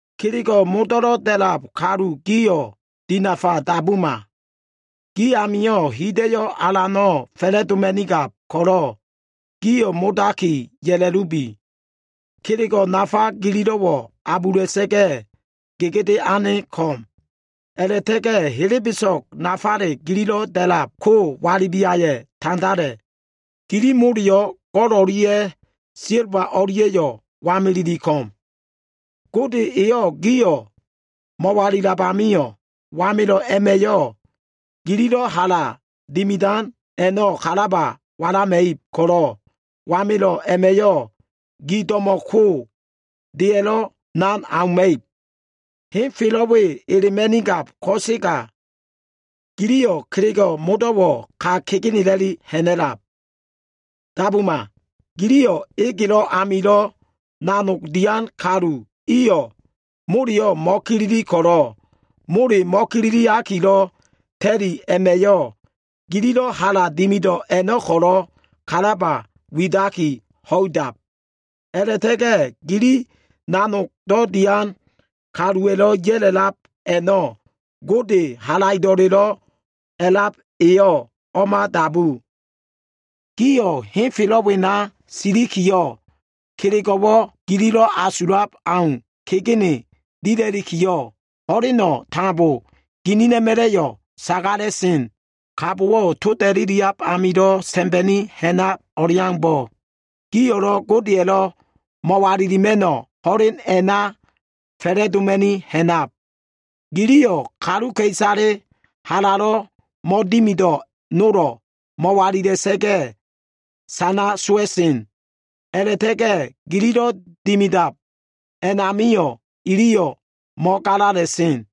Kelego꞉ modo꞉lo꞉ da꞉lab kalu gio꞉ dinafa dabuma. Gi amio꞉ hida꞉yo꞉ alano꞉ fa꞉la꞉doma꞉nigab ko꞉lo꞉, gio꞉ modaki ya꞉la꞉lubi. Kelego꞉ nafa gililo꞉wo꞉ abula꞉sa꞉ga꞉, gegede ane ko꞉m. A꞉la꞉ta꞉ga꞉ helebeso꞉g nafale gililo꞉ da꞉lab ko walibiaya꞉ tandala꞉. Gili moleyo꞉, go꞉l o꞉lia꞉ silba o꞉lia꞉yo꞉ wameleli ko꞉m. Gode eyo꞉ gio꞉ mo꞉walilab amio꞉, wamelo꞉ a꞉ma꞉yo꞉ gililo꞉ hala dimidan a꞉no꞉ kalaba walama꞉ib ko꞉lo꞉, wamelo꞉ a꞉ma꞉yo꞉ gi do꞉mo꞉ ko, deya꞉lo꞉ nan auma꞉ib. Ho꞉len we elema꞉nigab ko꞉sega giliyo꞉ kelego꞉ modo꞉wo꞉ ka kegenela꞉li ha꞉na꞉lab. Dabuma! Giliyo꞉ egelo꞉ amilo꞉ nanogdo꞉ dian kalu iyo꞉ moleyo꞉ mo꞉kilili ko꞉lo꞉, mole mo꞉kililiakilo꞉ ta꞉li a꞉ma꞉yo꞉, gililo꞉ hala dimido꞉ a꞉no꞉ ko꞉lo꞉ kalaba widaki ho꞉idab. A꞉la꞉ta꞉ga꞉ gili nanogdo꞉ dian kaluwa꞉lo꞉ ya꞉la꞉lab a꞉no꞉, Alan Halaido꞉lelo꞉ A꞉lab eyo꞉ o꞉ma dabu. Gio꞉ henfelo꞉ wena silikiyo꞉, kelego꞉wo꞉ gililo꞉ asulab au kegene dila꞉likiyo꞉, ho꞉leno꞉ tambo ginina꞉ma꞉la꞉yo꞉ sagala꞉sen. Kabowo꞉ toda꞉liliab amilo꞉ sa꞉mba꞉ni ha꞉nab o꞉leaumbo꞉, gio꞉lo꞉ Godeya꞉lo꞉ mo꞉walilima꞉no꞉ ho꞉len a꞉na fa꞉la꞉doma꞉ni ha꞉nab. Giliyo꞉ kaluka꞉isale halalo꞉ mo꞉dimido꞉ nolo꞉ mo꞉walila꞉sa꞉ga꞉ sana sowa꞉sen. A꞉la꞉ta꞉ga꞉ gililo꞉ dimidab a꞉namio꞉ iliyo꞉ mo꞉galala꞉sen.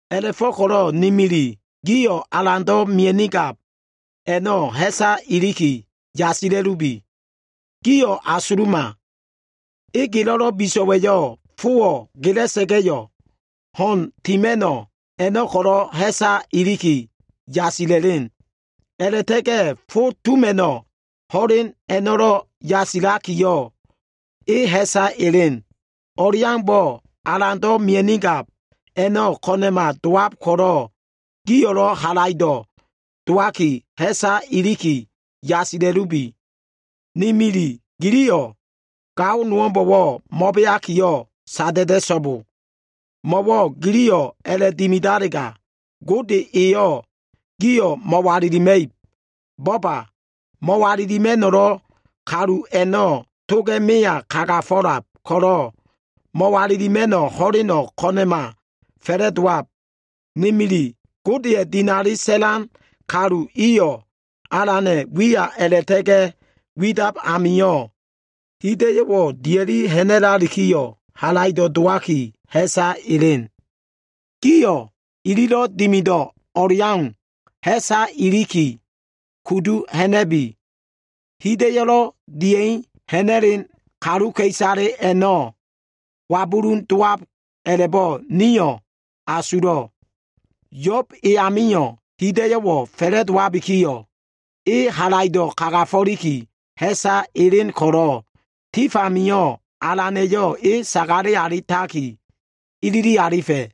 A꞉la꞉fo꞉ko꞉lo꞉ ni mili, gio꞉ Alando꞉ mia꞉nigab a꞉no꞉ ha꞉sa iliki yasila꞉lubi. Gio꞉ asuluma, egelo꞉lo꞉ biso꞉wa꞉yo꞉ fowo꞉ gela꞉sa꞉ga꞉yo꞉, ho꞉n tima꞉no꞉ a꞉no꞉ ko꞉lo꞉ ha꞉sa iliki yasila꞉sen. A꞉la꞉ta꞉ga꞉ fo tuma꞉no꞉ ho꞉len a꞉no꞉lo꞉ yasila꞉likiyo꞉, e ha꞉sa sen. O꞉leaumbo꞉, Alando꞉ mia꞉nigab a꞉no꞉ ko꞉na꞉ma dowab ko꞉lo꞉, gio꞉lo꞉ halaido꞉ dowaki, ha꞉sa iliki yasila꞉lubi. Ni mili, giliyo꞉ gao nowo꞉mbo꞉wo꞉ mo꞉beakiyo꞉ sada꞉da꞉so꞉bo. Mo꞉wo꞉ giliyo꞉ a꞉la꞉dimidalega, Gode eyo꞉ gio꞉ mo꞉walilima꞉ib. Bo꞉ba! Mo꞉walilima꞉no꞉lo꞉ kalu a꞉no꞉ toga꞉ meya kagafo꞉lab ko꞉lo꞉, mo꞉walilima꞉no꞉ ho꞉leno꞉ ko꞉na꞉ma fa꞉la꞉dowab. Ni mili, Godeya꞉ dinali sa꞉lan kalu iyo꞉, Alana꞉ wiya a꞉la꞉ta꞉ga꞉ widab amio꞉ hida꞉yo꞉wo꞉ dia꞉li ha꞉na꞉lalikiyo꞉, halaido꞉ dowaki, ha꞉sa elen. Gio꞉ ililo꞉ dimido꞉ o꞉leau, ha꞉sa iliki kudu ha꞉na꞉bi. Hida꞉yo꞉lo꞉ dia꞉i ha꞉na꞉len kaluka꞉isale a꞉no꞉ wabulun dowab a꞉la꞉bo꞉ nio꞉ asulo꞉. Yo꞉b e amio꞉ hida꞉yo꞉wo꞉ fa꞉la꞉dowabikiyo꞉, e halaido꞉ kagafo꞉liki ha꞉sa elen ko꞉lo꞉, tif amio꞉ Alana꞉yo꞉ e sagale alitaki ilili alifa꞉.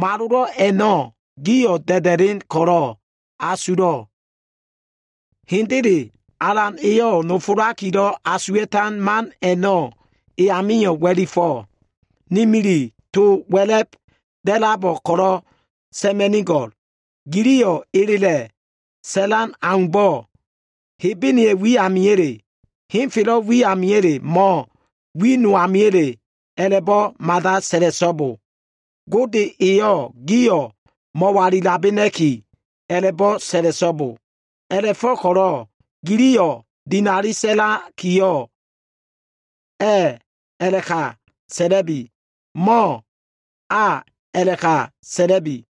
Malolo꞉ a꞉no꞉ gio꞉ da꞉da꞉len ko꞉lo꞉ asulo꞉. Hendele, Alan eyo꞉ nofolakilo꞉ asuwa꞉tan man a꞉no꞉, e amio꞉ wa꞉lifo꞉. Ni mili, to wa꞉la꞉b da꞉labo꞉ ko꞉lo꞉ sa꞉ma꞉nigo꞉l. Giliyo꞉ elela꞉ sa꞉lan aumbo꞉, Hebene wi amiya꞉le, henfelo꞉ wi amiya꞉le, mo꞉ wi no amiya꞉le a꞉la꞉bo꞉ mada sa꞉la꞉so꞉bo. Gode eyo꞉ gio꞉ mo꞉walilabena꞉ki, a꞉la꞉bo꞉ sa꞉la꞉so꞉bo. A꞉la꞉fo꞉ko꞉lo꞉ giliyo꞉ dinali sa꞉lakiyo꞉, “A꞉” a꞉la꞉ka sa꞉la꞉bi, mo꞉ “A” a꞉la꞉ka sa꞉la꞉bi.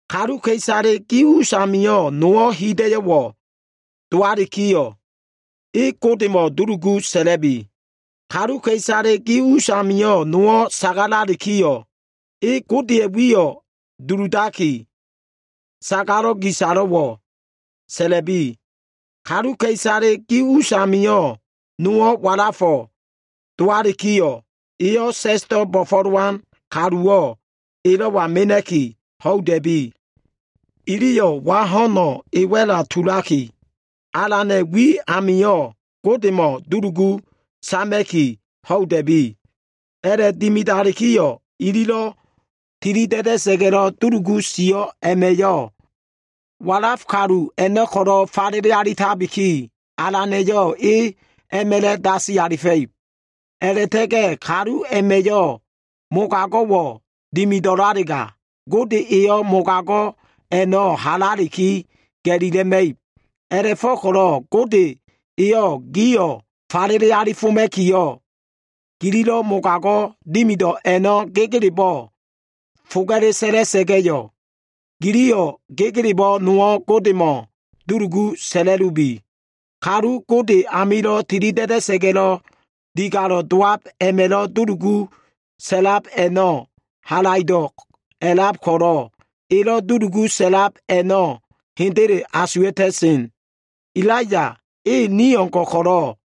Kaluka꞉isale gi usamio꞉ nowo꞉ hida꞉yo꞉wo꞉ dowalikiyo꞉, e Godemo꞉ dulugu sa꞉la꞉bi. Kaluka꞉isale gi usamio꞉ nowo꞉ sagalalikiyo꞉, e Godeya꞉ wiyo꞉ duludaki, sagalo꞉ gisalo꞉wo꞉ sa꞉la꞉bi. Kaluka꞉isale gi usamio꞉ nowo꞉ walafo꞉ dowalikiyo꞉, eyo꞉ sa꞉sdo꞉ bo꞉fo꞉lowan kaluwo꞉ elo꞉wa mena꞉ki ho꞉ida꞉bi. Iliyo꞉ wa ho꞉no꞉ e wa꞉la tulaki, Alana꞉ wi amio꞉ Godemo꞉ dulugu sama꞉ki, ho꞉ida꞉bi. A꞉la꞉dimidalikiyo꞉, ililo꞉ tilida꞉da꞉sa꞉ga꞉lo꞉ dulugu sio꞉ a꞉ma꞉yo꞉, walaf kalu a꞉no꞉ ko꞉lo꞉ falele alitabiki, Alana꞉yo꞉ e a꞉ma꞉la꞉ dasi alifa꞉ib. A꞉la꞉ta꞉ga꞉ kalu a꞉ma꞉yo꞉ mogago꞉wo꞉ dimido꞉lalega, Gode eyo꞉ mogago꞉ a꞉no꞉ halaliki ga꞉lila꞉ma꞉ib. A꞉la꞉fo꞉ko꞉lo꞉ Gode eyo꞉ gio꞉ falele alifoma꞉kiyo꞉, gililo꞉ mogago꞉ dimido꞉ a꞉no꞉ gegelebo꞉ foga꞉le sa꞉la꞉sa꞉ga꞉yo꞉, giliyo꞉ gegelebo꞉ nowo꞉ Godemo꞉ dulugu sa꞉la꞉lubi. Kalu Gode amilo꞉ tilida꞉da꞉sa꞉ga꞉lo꞉ digalo꞉ dowab a꞉ma꞉lo꞉ dulugu sa꞉lab a꞉no꞉, halaido꞉wo꞉ a꞉lab ko꞉lo꞉, elo꞉ dulugu sa꞉lab a꞉no꞉ hendele asuwa꞉ta꞉sen. Elaiya e ni o꞉ngo꞉ ko꞉lo꞉,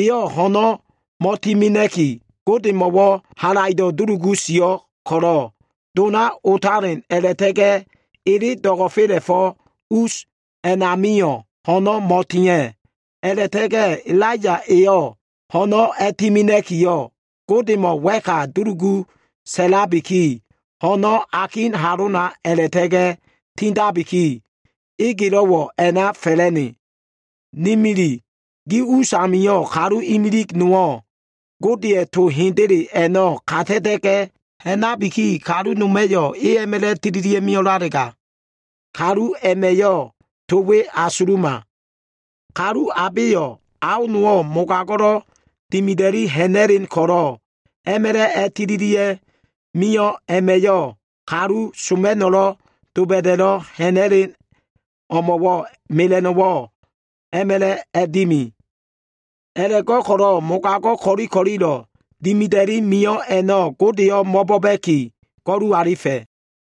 eyo꞉ ho꞉no꞉ mo꞉timena꞉ki, Godemo꞉wo꞉ halaido꞉ dulugu sio꞉ ko꞉lo꞉, dona otalen a꞉la꞉ta꞉ga꞉ ele do꞉go꞉fela꞉fo꞉ us a꞉namio꞉ ho꞉no꞉ mo꞉tia꞉. A꞉la꞉ta꞉ga꞉ Elaiya eyo꞉ ho꞉no꞉ a꞉timena꞉kiyo꞉, Godemo꞉ wa꞉ka dulugu sa꞉labiki, ho꞉no꞉ akin halona a꞉la꞉ta꞉ga꞉ tindabiki, egelo꞉wo꞉ a꞉na fa꞉la꞉ne. Ni mili, gi us amio꞉ kalu imilig nowo꞉ Godeya꞉ to hendele a꞉no꞉ kata꞉ta꞉ga꞉ ha꞉nabiki, kalu noma꞉yo꞉ e a꞉ma꞉la꞉ tililia꞉ mio꞉lalega, kalu a꞉ma꞉yo꞉, to we asuluma. Kalu abeyo꞉, ao nowo꞉ mogago꞉lo꞉ dimida꞉li ha꞉na꞉len ko꞉lo꞉ a꞉ma꞉la꞉ tililia꞉ mio꞉ a꞉ma꞉yo꞉, kalu soma꞉no꞉lo꞉ doba꞉da꞉lo꞉ ha꞉na꞉len o꞉mo꞉wo꞉ mela꞉no꞉wo꞉ a꞉ma꞉la꞉ dimi. A꞉la꞉go꞉ko꞉lo꞉ mogago꞉ ko꞉li ko꞉lilo꞉ dimida꞉li mio꞉ a꞉no꞉ Godeyo꞉ mo꞉bo꞉ba꞉ki, go꞉lu alifa꞉.